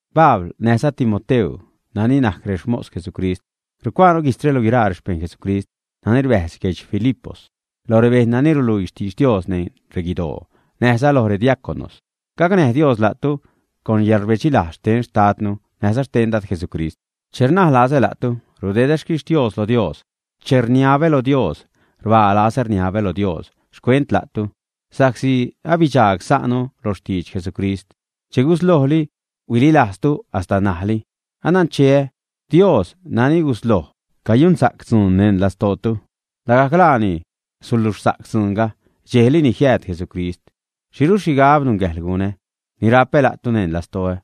Pabl näjza Timoteu, nani najc rexmos Jesucrist, rucuaanu guijtzre lo guiraa rexpejṉ Jesucrist nani rbäjz guedx Filipos, loj rebejṉ nani ruluii xtidx Dios neṉ reguidoo näjza loj rediaconos. Gacnäj Dios la'tu con yäḻrbedxi-lajz xten Xtadnu näjza xten Dad Jesucrist. Che rnaj lazä la'tu, rudedä xquixtios lo Dios. Che rniabä lo Dios, rbaa lazä rniabä lo Dios xcuent la'tu, sa'csi abidxaag sa'nu lo xtidx Jesucrist che guslojli huililajztu hasta ṉajli. Anancheä Dios nani gusloj cayunsa'c dzuun neṉ lastootu, lagajc laani suluxsa'c dzuunga dxejli ni jiääd Jesucrist. ¿Xhiru xhigab nungäjḻ gunä? Ni rapä la'tu neṉ lastoä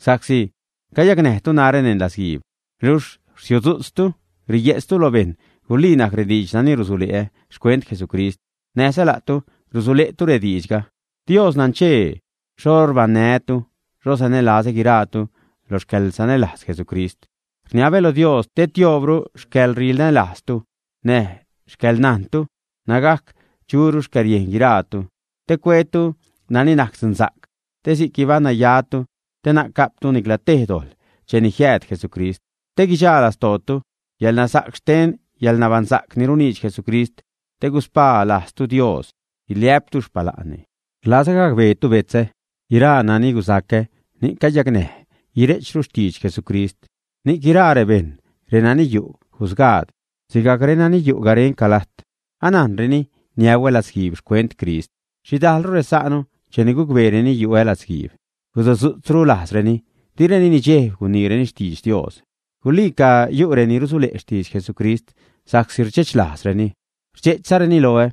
sa'csi cayacnäjtu narä neṉ latzguiib luxh rsiudzu'tztu riye'tztu lo bejṉ, gulii najc rediidx nani rusule'ä xcuent Jesucrist näjza la'tu rusule'tu rediidxga. Dios nanchee xho rbaṉnää́tu, xho sanälazä guiraatu lo xcäḻsanälajz Jesucrist. Rniabä lo Dios te tioobru xcäḻrinälajztu näj xcäḻnajntu nägajc churu xcäriejn guiraatu, te cuetu nani najc dzunsa'c te si'c guibaṉ nayatu, te na'c ga'ptu nicla tej dojḻ cheni jiääd Jesucrist. Te guidxa lastootu yälnasa'c xten te yäḻnabaṉsa'c ni runiidx Jesucrist, te guspaa lajztu Dios, guiliä'ptu xpala'nni. Rlazä gacbeetu betzä: guiraa nani gusacä ni'c cayacnäj guire'chru xtidx Jesucrist. Ni'c guiraa rebejṉ, renani yu' jusgaad sigajc renani yu' garenca lajt, anajnreni niäuä latzguiib xcuent Crist. Xhidajlru resa'nu cheni gucbeereni yu'ä latzguiib, gusudzu'tzru lajzreni, direni nidxejb, guniirureni xtidx Dios. Guliica yu' reni rusule' xtidx Jesucrist sa'csi rdxe'ch lajzreni, rdxe'chzareni loä.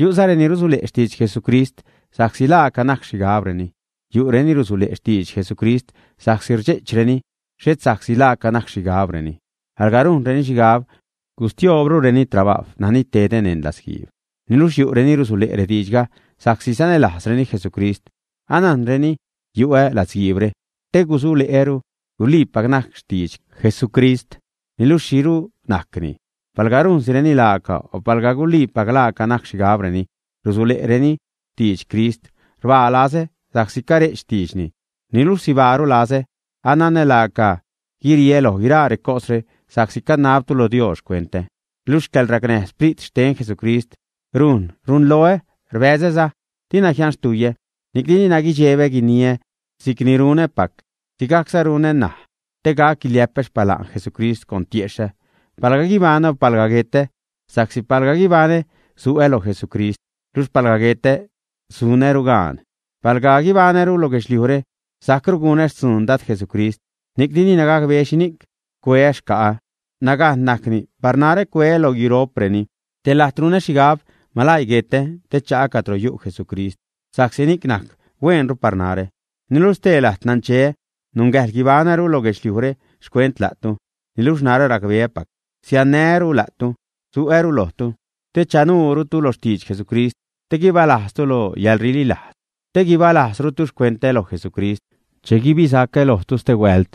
Yu'za reni rusule' xtidx Jesucrist sa'csi laaca najc xhigabreni. Yu'reni rusule' xtidx Jesucrist sa'csi rdxe'chreni, xhet sa'csi laaca najc xhigabreni, alga rujnreni xhigab gustioobrureni trabajw nani tedä neṉ latzguiib. Niluxh yu' reni rusule' rediidxga sa'csi sanälajzreni Jesucrist. Anajnreni yu'ä latzguiibre te gusule'äru guliipac najc xtidx Jesucrist. Niluxh ¿xhiru najcni? Palga rujnsireni laaca o palga guluiipac laaca najc xhigabreni rusule'reni xtidx Crist; rbaa lazä sa'csi care'ch xtiidxni niluxh sibaaru lazä. Ananä laaca guiriä loj guiraa recosre sa'csi canabtu lo Dios xcuentä. Luxh xcäḻracnäj Sprit xten Jesucrist rujn runloä, rbäzäza dina jianxtuiä. Ni'cni dina guidxebä guiniä, si'cni runäpac, sigajcza runä ṉaj te gac guiliä'pä xpala'n Jesucrist con tiexhä palga guibaṉä o palga guetä. Sa'csi palga guibaṉä, su'ä lo Jesucrist; luxh palga guetä sunäru gaan. Palga guibaṉäru lo guedxliujre, sajcru gunä xtzuun Dad Jesucrist, ni'cni dina gacbeä xhinic cueä xca'ä. Nagajn najcni par narä cueä lo guiro'preni. Te lajt runä xhigab: malaii guetä te cha'a cadro yu' Jesucrist sa'csi ni'c najc hueenru par narä. Niluxh stee lajt nancheä nungäjḻ guibaṉäru lo guedxliujre xcuent la'tu. Niluxh narä racbeäpac siannää́ru la'tu, su'äru lojtu te chanuurutu lo xtidx Jesucrist, te guibalajztu lo yäḻrililajz, te guibalajzrutu xcuentä loj Jesucrist che guibisacä lojtu stehuält.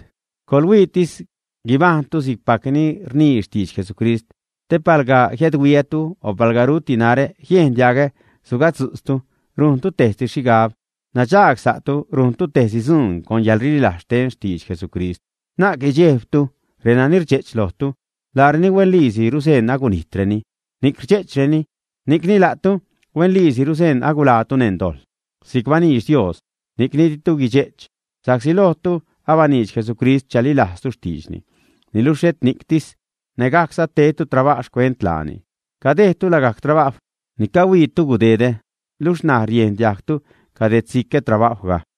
Coḻhuiitis guibajṉtu si'cpac ni rnii xtidx Jesucrist, te palga jiädhuiätu o palga ruti narä, jiejn diagä sugadzu'tztu, rujntu tejsi xhigab, nadxaag sa'tu rujntu tejsi dzuun con yäḻrililajz xten xtidx Jesucrist. Na'c guidxejbditu renani rdxe'ch lojtu. Laareni huenliisi ruseṉ agunijtreni ni'c rdxe'chreni, ni'cni la'tu huenliisi ruseṉ aguḻaatu neṉ dojḻ si'c baniidx Dios, ni'cni ditu guidxe'ch. Sa'csi lojtu abaniidx Jesucrist chalilajztu xtiidxni. Niluxh xhet ni'ctis; nägajcza tedtu trabajw xcuent laani. Cadejdtu lagajc trabajw ni cahuiitu gudedä luxh ṉaj riejn diajgtu cadedsicä trabajwga.